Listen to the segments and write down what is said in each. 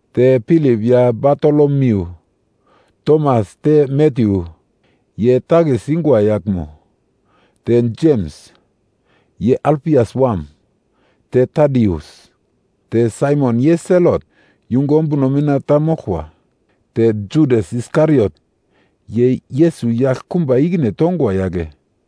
Te Pilip ya Batolomiu, Tomas, te Matyu, ye takis yungwa yaglmo. Te Jems, ye Alfias wam, te Tadius. Te Saimon ye Selot yungu ombuno mina ta moglkwa. Te Judas Iskariot, ye Yesus yaglkumba ikine tongwa yagle.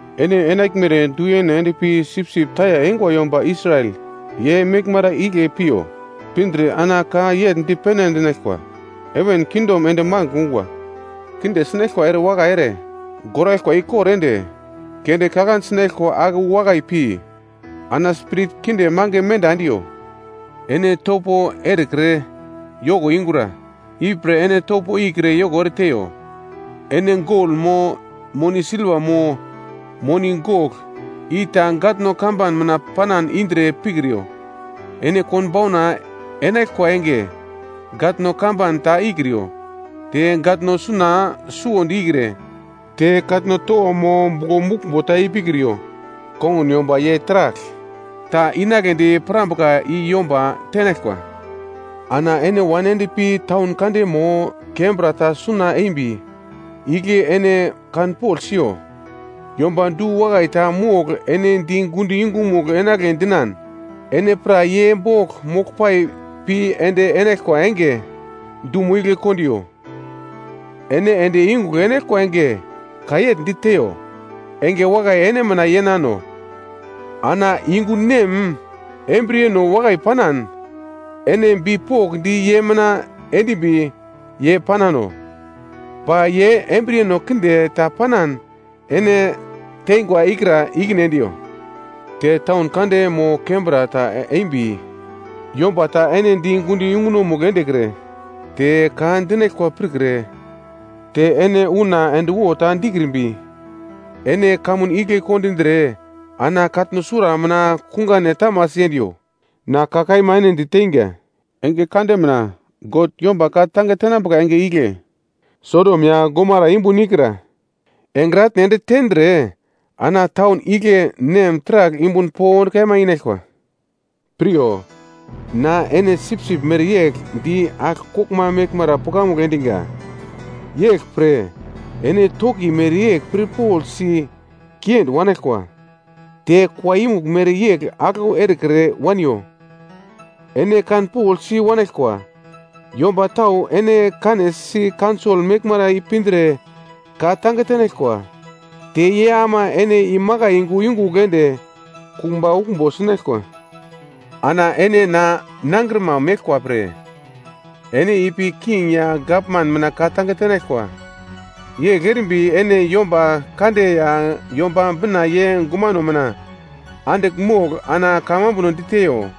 Ene enaglmere du-yene endpi sipsip taya eingwa yomba Israel ye meglmara igle piyo. Pindre ana ka yegl dipene endinaglkwa, ‘Heven kingdom ende magl ungwa.’ Kinde sinaglkwa erewakai ere, goraglkwa ikor ende, kende kaglande sinaglkwa ake wu wakai pi, ana spirit kinde mange menda endiyo. Ene topo erekre yoko ingura, ipre ene topo ikre yoko ereteiyo. Ene gol mo, moni silva mo, moni gogl, i ta gatno kamban mina panan indre pikriyo. Ene konbauna enaglkwa enge, gatno kamban ta ikriyo. Te gatno suna suwondi ikre, te katno towo mo buglo muglmbo ta ipikriyo. Kongun yomba ye taragl ta inagledi pirambuka i yomba tenaglkwa. “Ana ene wan ende pi taun kande mo, kembra ta suna eimbi igle ene kanpogl siyo, yomba du-wakai ta mogl ene di gundo yungumugl enagle dinan, ene pra ye bogl moglpai pi ende enaglkwa enge dumo igle kondiyo. Ene ende yungugl enaglkwa enge, ka yegl diteyo, ‘Enge wakai ene mina yenano.’ Ana yungu nem embriyeno wakai panan ene bipokndi ye mina endimbi yei-panano. Ba ye embriyeno kinde ta panan ene tengwa ikra ikine endiyo. Te taun kande mo kembra ta embi yomba ta ene di gundo yungunomugl endekre, te ka dinaglkwa pirkre, te ene una endwo ta dikrimbi, ene kamun igle kondindre ana katno sura mina kungane tamasi endiyo. Na ka kaima ene diteinga, enge kande mina God yomba ka-tange tenambuka enge igle, Sodom ya Gomara yumbun ikra engre atne ende tendre, ana taun igle nem taragl yumbun pond kaima inaglkwa. “Piryo, na ene sipsip mereyegl di agl koglma meglmara pukamugl endiga. Yeglpre ene toki mereyegl pirpoglsi kiendi wanaglkwa. Te kua yumugl mereyegl aglau erekre waniyo. Ene kanpoglsi wanaglkwa, yomba tau ene kanesi kaunsol meglmara ipindre ka-tange tenaglkwa. Te ye ama ene imakai yungu yungugl ende kumba uglmbo sinaglkwa. Ana ene na nangrima meglkwa pre, ene ipi king ya gavman mina ka-tange tenaglkwa. Yegl erimbi ene yomba kande ya Yomba Bina ye gumano mina andigl mogl ana kamambuno diteyo.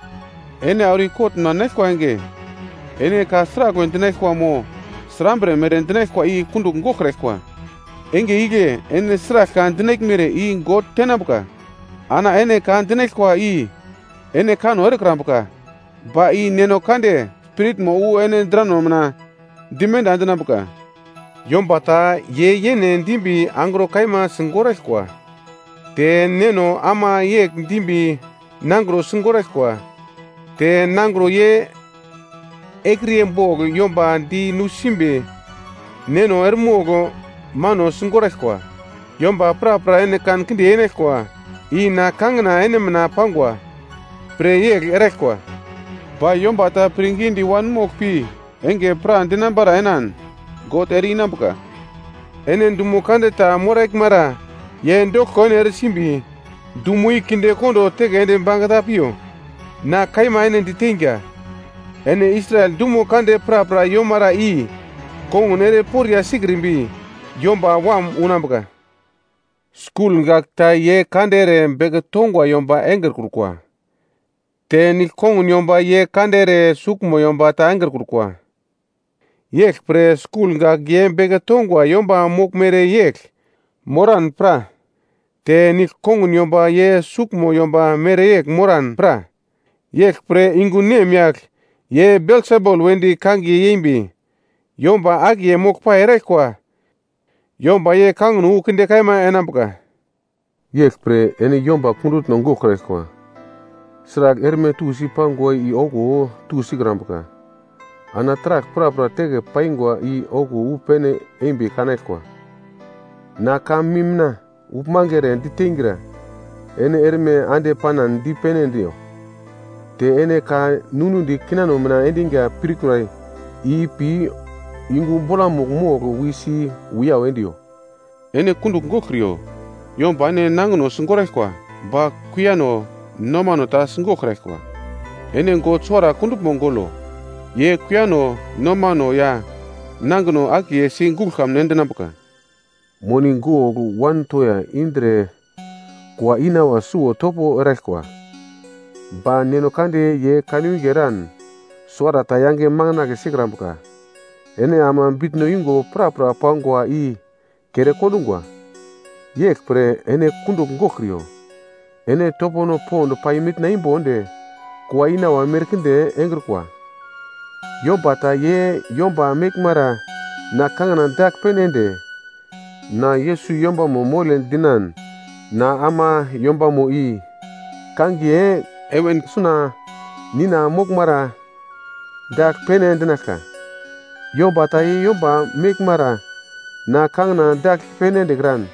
Ene auro i-kot mina enaglkwa enge, ene ka sraglwe dinaglkwa mo srambre mere dinaglkwa i kundugl goglkraglkwa. Enge igle ene sragl ka dinaglmere i God tenambuka. Ana ene ka dinaglkwa, i ene kanno erekrambuka. Ba i Neno Kande Spiritmo wu ene drano mina dimenda endinambuka. “Yomba ta ye yene dimbi angro kaima sigoraglkwa. Te neno ama yegl dimbi nangro sigoraglkwa. Te nangro ye ekriye bogl yomba di nusimbi neno eremogl mano sigoraglkwa. Yomba prapra ene kankinde yenaglkwa, i na kangina ene mina pangwa pre yegl eraglkwa. Ba yomba ta pirngidi wanmogl pi enge pradinambara enan, God ere-inambuka. Ene dumo kande ta moraglmara ye doglko ene eresimbi, dumo i kondo teke ende bangeta piyo. Na kaima ene diteinga, ene Israel dumo kande prapra yeiomara i kongun ere poriya sikrimbi, Yomba Wam unambuka. “Skul gak ta ye kande ere beke tongwa yomba engrekrukwa, te nigl-kongun yomba ye kande ere suglmo yomba ta engrekrukwa. Yeglpre skul gak ye beke tongwa yomba moglmere yegl moran pra, te nigl-kongun yomba ye suglmo yomba mereyegl moran pra. Yeglpre yungu nemyagl ye Belsebul wedi kangiye yeimbi, yomba akiye moglpai erikwa yomba ye kangino wu kinde kaima enambuka. “Yeglpre, ene yomba kundutno goglkraglkwa. Sragl erme tusi pangwa i okuwo tusikrambuka, ana taragl prapra teke paingwa i okuwo wu pene embi kanaglkwa. Na ka mim mina uglmange ere diteingra, ene erme ande panan dipene endiyo. Te ene ka ninudi kinano mina endinga pirkura i ipi yungu bolamugl mogl wisi wiyau endiyo. Ene kundugl goglkriyo, yomba ene nangino sigoraglkwa ba kuiyano nomano ta sigoglkraglkwa. Ene God suwara kunduglmo golo. Ye kuiyano nomano ya nangino akiye si guglo kamun endinambuka. Moni gogl wan toya indre kua inawa suwo topo eraglkwa, ba Neno Kande ye kanwinge eran suwarata yange makandle sikrambuka. Ene ama bitno yungo prapra pangwa i kere kondungwa. Yeglpre ene kundugl goglkriyo, ene topono pond pai mitna imbo ende kua inawa merkinde engrikwa. “Yomba ta ye yomba meglmara na kangina dagl pene ende, na Yesus yombamo mole dinan na ama yombamo i kangiye heven suna Nina moglmara dagl pene endinaglka. Yomba ta ye yomba meglmara na kangina dagl pene endekran,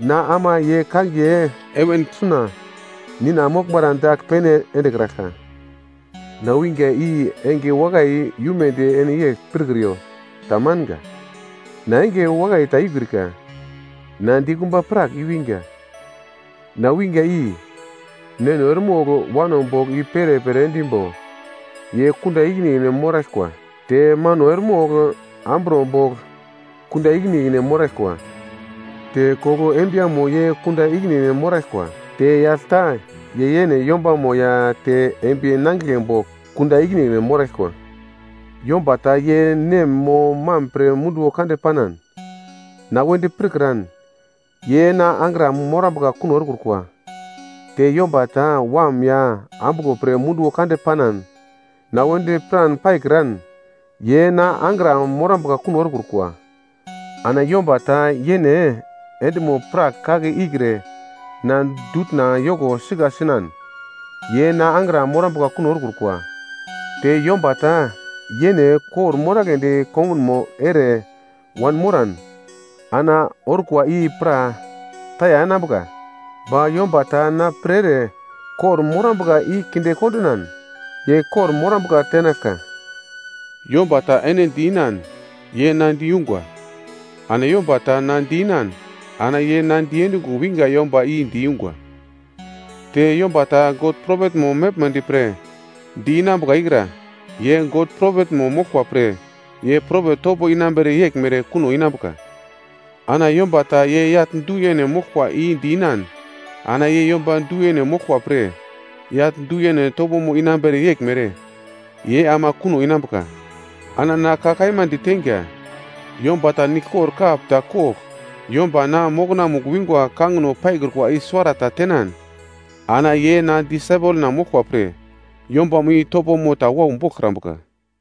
na ama ye kangiye heven suna Nina moglmara dagl pene endekraglka. “Na winga i enge wakai i-umedi ene yegl pirkriyo. Tamanga. Na enge wakai ta i-ukrika, na dikumba prak i-winga. Na winga i: “‘Neno eremogl wano bogl i-perepere endimbo, ye kunda ikine ikine moraglkwa. Te mano eremogl amburo bogl kunda ikine ikine moraglkwa. Te koglo embiyamo ye kunda ikine ikine moraglkwa. Te yagl ta ye yene yombamo ya te embiye nangigle bogl kunda ikine ikine moraglkwa.’ “Yomba ta ye nem mo mam pre munduwo kande panan, na wedi pirkran ye na angra morambuka kuno erekrukwa. Te yomba ta wam ya ambuglo pre munduwo kande panan, na wedi piran paikran ye na angra morambuka kuno erekrukwa. Ana yomba ta yene endimo-prak kake ikre na dutna yoko sika sinan, ye na angra morambuka kuno erekrukwa. Te yomba ta yene kor-moragledi kongunmo ere wanmoran ana orkwa i pra taya enambuka. Ba yomba ta na pre ere kor-morambuka i kinde kondinan ye kor-morambuka tenaglka. “Yomba ta ene di-inan, ye na diyungwa. Ana yomba ta na di-inan, ana ye na diendungo winga yombamo i diyungwa. Te yomba ta God propetmo moglmedi pre di-inambuka ikra, ye God propetmo moglkwa pre ye propet topo inambere yeglmere kuno inambuka. Ana yomba ta ye yagl du-yene moglkwa i di-inan, ana ye yomba du-yene moglkwa pre, yagl du-yene topo inambere yeglmere, ye ama kuno inambuka. Ana na ka kaima diteinga, yomba ta niglkor kap ta kogl yomba na mokonamugl wingwa kangino paikrukwa i suwarata tenan, ana ye na disaipel moglkwa pre, yombamo i topomo ta wau boglkrambuka.”